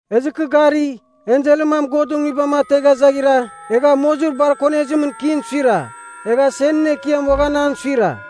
Ezɨ kɨ gari, enselɨn mam Godɨn Nguibam ategha zaghira, egha mozir bar konezimɨn kin suira. Egha senɨn ekiam uaghan an suira.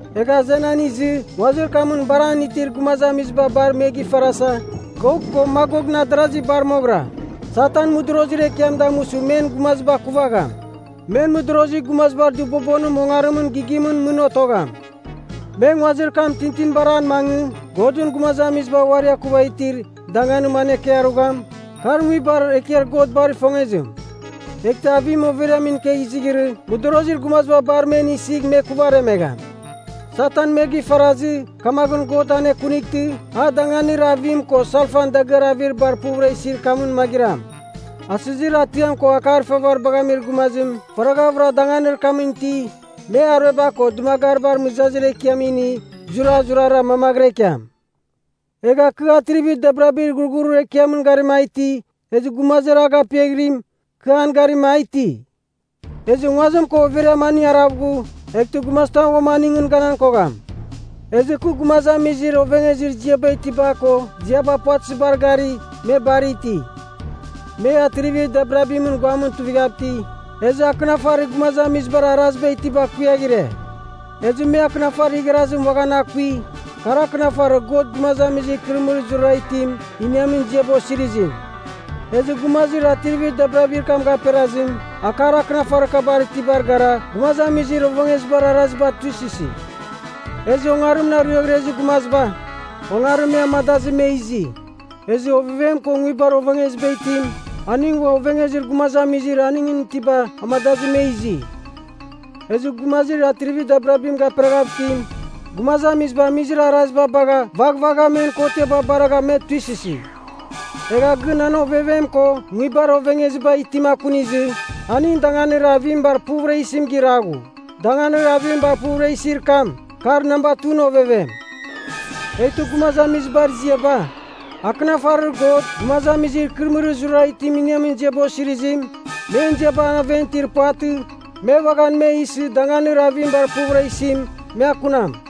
Egh azenan izɨ nguazir kamɨn bar an itir gumazamiziba bar me gifarasa, Gok ko Magokɨn adarazi bar moghɨra. Satan mɨdorozir ekiam damusɨ men gumaziba akuvagham. Men mɨdorozir gumazibar dɨbobonim ongarimɨn gighimɨn mɨn otogham. Me nguazir kam tintinibar an mangɨ Godɨn gumazamiziba uari akuva itir danganim anekɨarugham, kar nguibar ekiar God bar ifongezim. Eghtɨ avim overiamɨn ikegh izighirɨ mɨdorozir gumaziba bar men isigh me kuvaremegham. Satan me gifarazɨ, kamaghɨn God anekunightɨ a danganir avim ko salfan dagɨar avir bar puvɨra isir kamɨn magɨram. Asɨzir atiam ko akar ifavaribagh amir gumazim faraghavɨra danganir kamɨn iti, me arueba ko dɨmagaribar mɨzazir ekiam ini zurazurara mamaghɨra ikiam. Egha kɨ atrivir dabirabir ghurghurir ekiamɨn garima a iti, ezɨ gumazir a gapiaghirim, kɨ an garima a iti. Ezɨ nguazim ko overiam aning arav ghu, eghtɨ gumazitam uam aningɨn ganan kogham. Ezɨ kɨ gumazamizir ovengezir ziaba itiba ko ziaba puvatɨzibar gari, me bar iti. Me atrivir dabirabimɨn guamɨn tuivighav iti, ezɨ akɨnafarir gumazamizibar araziba itiba kuiaghire. Ezɨ me akɨnafarir igharazim uaghan akui, kar akɨnafarir God gumazamizir ikɨrɨmɨrir zurara itim iniamin ziaba osirizim. Ezɨ gumazir atrivir dabirabir kam gaperazim akar akɨnafarir kabar itibar gara gumazamizir ovengezibar araziba tuisɨsi. Ezɨ ongarimɨn ariaghrezir gumaziba, ongarim me amadazɨ me izi. Ezɨ Ovevem ko Nguibar Ovengeziba Itim, aning ua ovengezir gumazamizir aningɨn itiba amadazɨ me izi. Ezɨ gumazir atrivir dabirabim gaperaghav itim, gumazamiziba amizir araziba bagha vaghvagha men kotiaba baragha me tuisɨsi. Egha gɨn an Ovevem ko Nguibar Ovengeziba Itim akunizɨ, aning danganir avim bar puvɨra isim giraghu. Danganir avim bar puvɨra isir kam, kar namba 2ɨn ovevem. Eghtɨ gumazamizibar ziaba, akɨnafarir God gumazamizir ikɨrɨmɨrir zurara itim iniamin ziaba osirizim, men ziaba aven itir puvatɨ, me uaghan me isɨ danganir avim bar puvɨra isim, me akunam.